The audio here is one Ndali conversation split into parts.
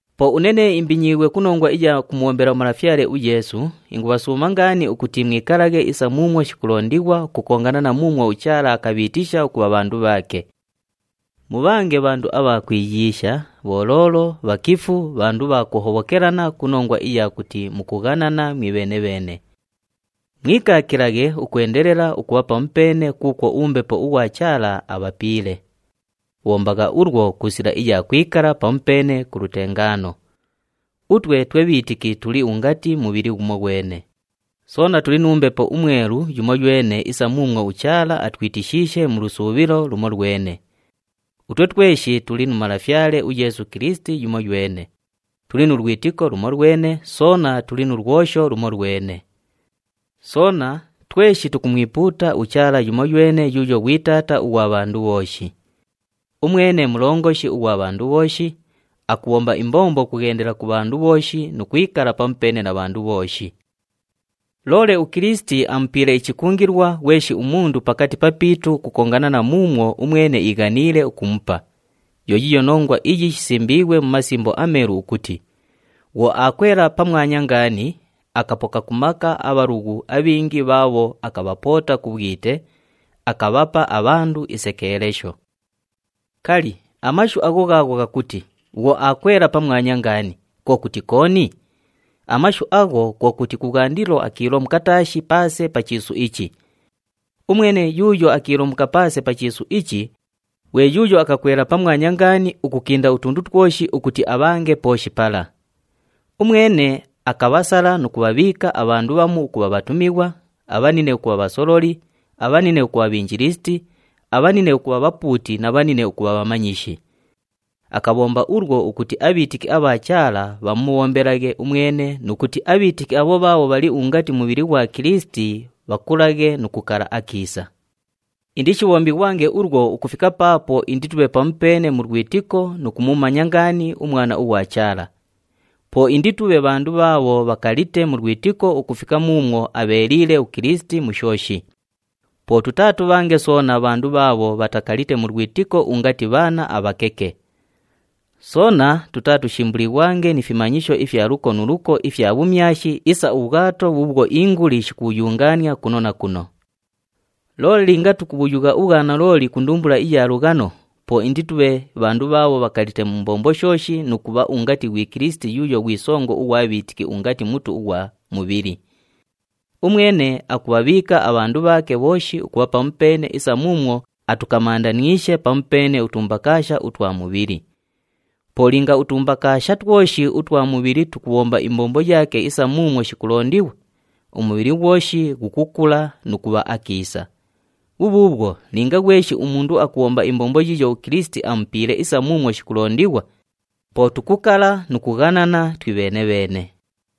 Po une nee imbinyiighwe ku nongwa iya kumubhombela uMalafyale uYeesu, ingubhasuuma ngaani ukuti mwikalaghe isa muumwo shikulondighwa ukukongana na muumwo uChaala akabhiitisha ukubha bhandu bhaake. Mubhange bhandu abha kwiyiisha, bholoolo, bhakifu, bhandu bha kuhobhokelana ku nongwa iya kuti mukughanana mwibheene-bheene. Mwikaakilaghe ukwendelela ukubha pamupeene kuukwo uMbepo ughwa Chaala abhapiile. Bhombagha ulwo ku sila iya kwikala pamupeene ku lutengaano. Utwe twe bhiitiki tuli ungati mubhili ghumoghwene, soona tuli nu Mbepo uMwelu yumoywene isa muumwo uChaala atwitishiishe mu lusuubhilo lumolwene. Utwe tweshi tuli nu Malafyale uYeesu Kilisiti yumoywene, tuli nu lwitiko lumolwene, soona tuli nu lwosho lumolwene. Soona, tweshi tukumwipuuta uChaala yumoywene yuuyo ghwi Taata ughwa bhandu bhooshi. Umwene mulongoshi ughwa bhandu bhooshi, akubhomba imbombo ukughendela ku bhandu bhooshi nu kwikala pamupeene na bhandu bhooshi. Loole uKilisiti amupiile ichikungilwa ghweshi umundu pakati papiitu ukukongana na muumwo umwene iighaniile ukumupa. Yo yiiyo nongwa iyi shisimbiighwe mu Masimbo aMeelu ukuti, “Bhwo aakwela pamwanya ngaani, akapoka ku maka abhalughu abhingi bhaabho akabhapoota ku bhwite, akabhapa abhandu isekeelesho.” Kali, amashu agho ghaagho ghakuti, “Bhwo aakwela pamwanya ngaani,” kwo kuti kooni? Amashu agho kwo kuti kubhwandilo akiilomuka taashi paase pa chiisu ichi. Umwene yuuyo akiilomuka paase pa chiisu ichi, ghwe yuuyo akakwela pamwanya ngaani ukukinda utundu twoshi ukuti abhange pooshi pala. Umwene akabhasala nu kubhabhiika abhandu bhamu ukubha bhatumighwa, abhanine ukubha bhasololi, abhanine ukubha bhinjilisiti, abhanine ukubha bhapuuti na bhanine ukubha bhamanyishi. Akabhomba ulwo ukuti abhiitiki abha Chaala bhamubhombelaghe umwene nu kuti abhiitiki abho bhaabho bhali ungati mubhili ghwa Kilisiti bhakulaghe nu kukala akiisa. Indishibhombighwange ulwo ukufika paapo inditubhe pamupeene mu lwitiko nu kumumanya ngaani uMwana ughwa Chaala. Po inditubhe bhandu bhaabho bhakalite mu lwitiko ukufika muumwo abheeliile uKilisiti mu shooshi. Po tutaatubhange soona bhandu bhaabho bhatakalite mu lwitiko ungati bhaana abhakeke. Soona tutaatushimbulighwange ni fimanyisho ifya luko nu luko ifya bhumyashi isa ubhwato bhuubhwo inguli shikubhuyungaania kuno na kuno. Loole linga tukubhuyugha ubhwanalooli ku ndumbula iya lughano, po inditubhe bhandu bhaabho bhakalite mu mbombo shooshi nu kubha ungati ghwi Kilisiti yuuyo ghwi songo ughwa bhiitiki ungati mutu ughwa mubhili. Umwene akubhabhiika abhandu bhaake bhooshi ukubha pamupeene isa muumwo atukamandaniishe pamupeene utumbakaasha utwa mubhili. Po linga utumbakaasha twoshi utwa mubhili tukubhomba imbombo yaake isa muumwo shikulondighwa, umubhili ghwoshi ghukukula nu kubha akiisa. Bhubhuubhwo linga ghweshi umundu akubhomba imbombo yiiyo uKilisiti amupiile isa muumwo shikulondighwa, po tukukala nu kughanana twibheene-bheene.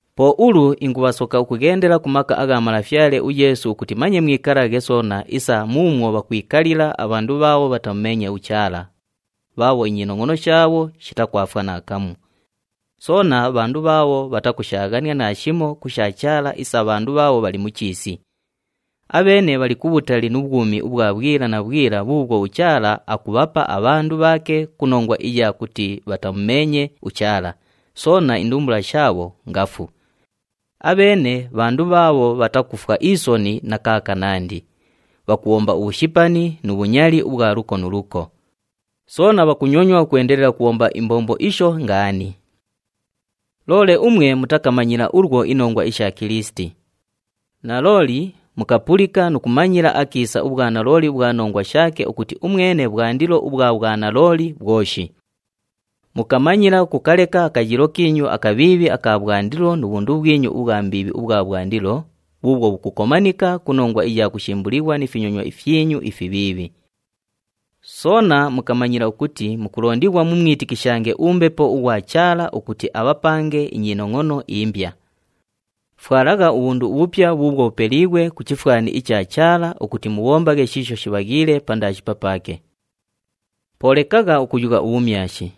Po ulu ingubhasoka ukughendela ku maka agha Malafyale uYeesu ukuti manye mwikalaghe soona isa muumwo bhakwikalila abhandu bhaabho bhatamumeenye uChaala, bhaabho inyinongʼono shaabho shitakwafwa naakamu. Soona, bhandu bhaabho bhatakushaaghania naashimo ku sha Chaala isa abhandu bhaabho bhali mu chiisi. Abheene bhali kubhutali nu bhwumi ubhwa bhwila na bhwila bhuubhwo uChaala akubhapa abhandu bhaake ku nongwa iya kuti bhatamumeenye uChaala, soona indumbula shaabho ngafu. Abheene bhandu bhaabho bhatakufwa isoni na kaakanandi, bhakubhomba ubhushipani nu bhunyali ubhwa luko nu luko. Soona bhakunyonywa ukwendelela ukubhomba imbombo isho ngaani. Loole umwe mutakamanyila ulwo inongwa isha Kilisiti. Nalooli mukapulika nu kumanyila akiisa ubhwanalooli ubhwa nongwa shaake ukuti umwene bhwandilo ubhwa bhwanalooli bhwoshi. Mukamanyila ukukaleka akayiilo kiinyu akabhiibhi aka bhwandilo nu bhundu bhwinyu ubhwa mbiibhi ubhwa bhwandilo, bhuubhwo bhukukomanika ku nongwa iya kushimbulighwa ni finyonywa fyinyu ifibhiibhi. Soona mukamanyila ukuti mukulondighwa mumwitikishange uMbepo ughwa Chaala ukuti abhapange inyinongʼono imbya. Fwalagha ubhundu ubhupya bhuubhwo bhupeliighwe ku chifwani icha Chaala ukuti mubhombaghe shiisho shibhaghiile pandaashi papaake. Po lekagha ukuyugha ubhumyashi.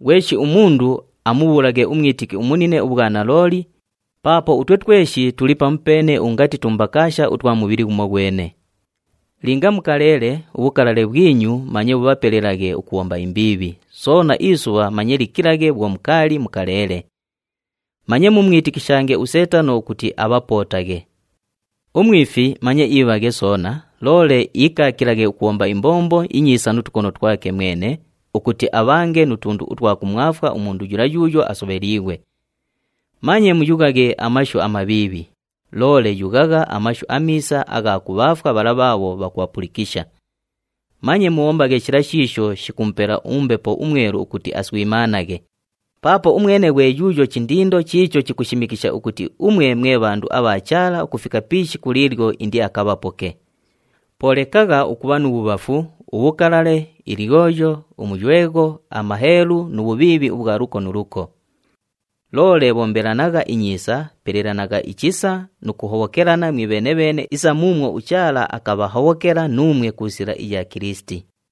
Ghweshi umundu amubhuulaghe umwitiki umunine ubhwanalooli paapo utwe tweshi tuli pamupeene ungati tumbakaasha utwa mubhili ghumoghwene. Linga mukaleele, ubhukalale bhwinyu manye bhubhapelelaghe ukubhomba imbiibhi, soona isubha manye likilaghe bhwo mukaali mukaleele. Manye mumwitikishange uSeetano ukuti abhapootaghe. Umwifi manye iibhaghe soona, loole iikaakilaghe ukubhomba imbombo inyiisa nu tukono twake mwene, ukuti abhange nu tundu utwa kumwafwa umundu yula yuuyo asobheliighwe. Manye muyughaghe amashu amabhiibhi, loole yughagha amashu amiisa agha kubhaafwa bhala bhaabho bhakubhapulikisha. Manye mubhombaghe shila shiisho shikumupela uMbepo uMwelu ukuti aswimaanaghe, paapo umwene ghwe yuuyo chindindo chiicho chikushimikisha ukuti umwe mwe bhandu abha Chaala ukufika pi ishiku liilyo indiakabhapoke. Po lekagha ukubha nu bhubhafu, ubhukalale, ilyoyo, umuywegho, amaheelu nu bhubhiibhi ubhwa luko nu luko. Loole bhombelanagha inyiisa, pelelanagha ichisa nu kuhobhokelana mwibheene-bheene isa muumwo uChaala akabhahobhokela nuumwe ku sila iya Kilisiti.